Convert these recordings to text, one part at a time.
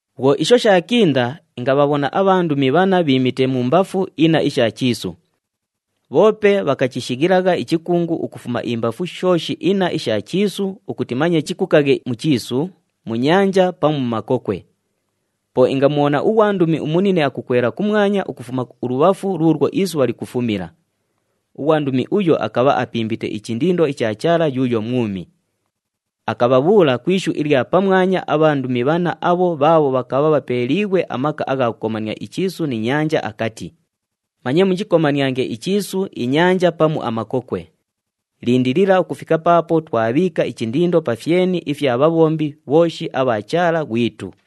Bhwo isho shaakinda, ingabhabhona abhandumi bhanna bhiimite mumbafu inna isha chiisu. Bhoope bhakachishighilagha ichikungu ukufuma imbafu shooshi inna isha chiisu ukuti manye chikukaghe mu chiisu, mu nyanja pamu mu makokwe. Po ingamubhona ughwandumi umunine akukwela kumwanya ukufuma ulubhafu luulwo isubha likufumila. Ughwandumi uyo akabha apimbite ichindindo icha Chaala yuuyo mwumi. Akabhabhuula ku ishu ilya pamwanya abhandumi bhanna abho bhaabho bhakabha bhapeeliighwe amaka agha kukomania ichiisu ni nyanja, akati, “Manye muchikomaniange ichiisu, inyanja pamu amakokwe. Lindilila ukufika paapo twabhiika ichindindo pa fyeni ifya bhabhombi bhooshi abha Chaala ghwitu.”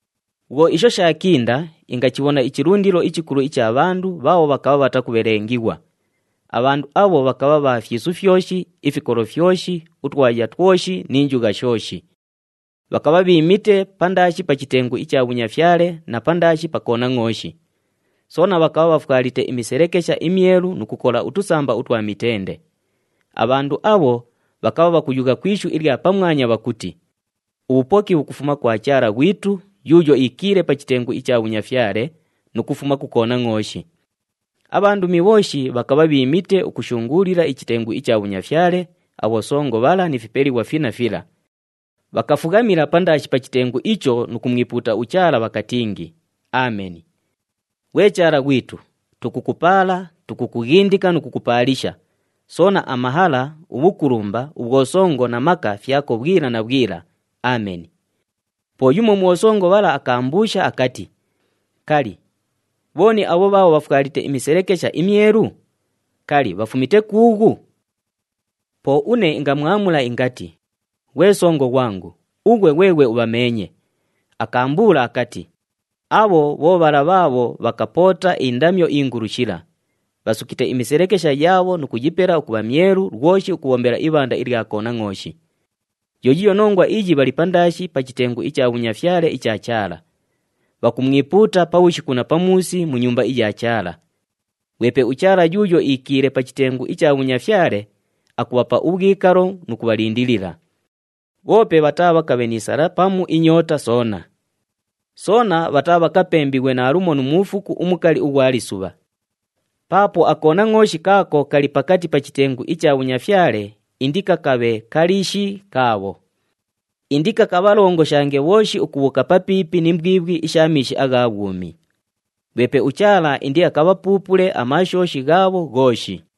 Bhwo isho shaakinda, ingachibhona ichilundilo ichikulu icha bhandu bhaabho bhakabha bhatakubhelengighwa. Abhandu abho bhakabha bha fyisu fyoshi, ifikolo fyoshi, utwaya twoshi ni njugha shooshi. Bhakabha bhiimite pandaashi pa chitengu icha bhunyafyale na pandaashi pa Konangʼooshi. Soona bhakabha bhafwalite imiselekesha imyelu nu kukola utusamba utwa mitende. Abhandu abho, bhakabha bhakuyugha ku ishu ilya pamwanya bhakuti, “Ubhupoki bhukufuma kwa Chaala ghwitu, yuuyo iikiile pa chitengu icha bhunyafyale, nu kufuma ku Konangʼooshi.” Abhandumi bhooshi bhakabha bhiimite ukushunguulila ichitengu icha bhunyafyale, abhosongo bhala ni fipelighwa finna fila. Bhakafughamila pandaashi pa chitengu icho nu kumwipuuta uChaala, bhakatingi, “Ameni! Ghwe Chaala ghwitu, tukukupaala, tukukughindika nu kukupaalisha, soona amahala, ubhukulumba, ubhwosongo na maka fyako bhwila na bhwila. Ameni!” Po yumo mu bhosongo bhala akaambuusha akati, “Kali, bhooni abho bhaabho bhafwalite imiselekesha imyelu? Kali, bhafumite kuughu?” Po une ingamwamula ingati, “Ghwe songo ghwangu, ughwe ghweghwe ubhameenye.” Akaambuula akati, “Abho bho bhala bhaabho bhakapoota indamyo ingulu shila. Bhasukite imiselekesha yaabho nu kuyipela ukubha myelu lwoshi ukubhombela ibhanda ilya Konangʼooshi. Yo yiiyo nongwa iyi bhali pandaashi pa chitengu icha bhunyafyale icha Chaala. Bhakumwipuuta pabhushiku na pamuusi mu Nyumba iya Chaala. Ghwepe uChaala yuuyo iikiile pa chitengu icha bhunyafyale, akubhapa ubhwikalo nu kubhalindilila. Bhoope bhataabhakabhe ni sala pamu inyoota soona. Soona bhataabhakapembighwe naalumo nu muufuku umukali ughwa lisubha. Paapo aKonangʼooshi kaako kali pakati pa chitengu icha bhunyafyale indikakabhe kaliishi kaabho. Indikakabhalongoshange bhooshi ukubhuuka papiipi ni mbwibhwi isha miishi agha bhwumi. Ghwepe uChaala indiakabhapuupule amaashooshi ghaabho ghooshi.”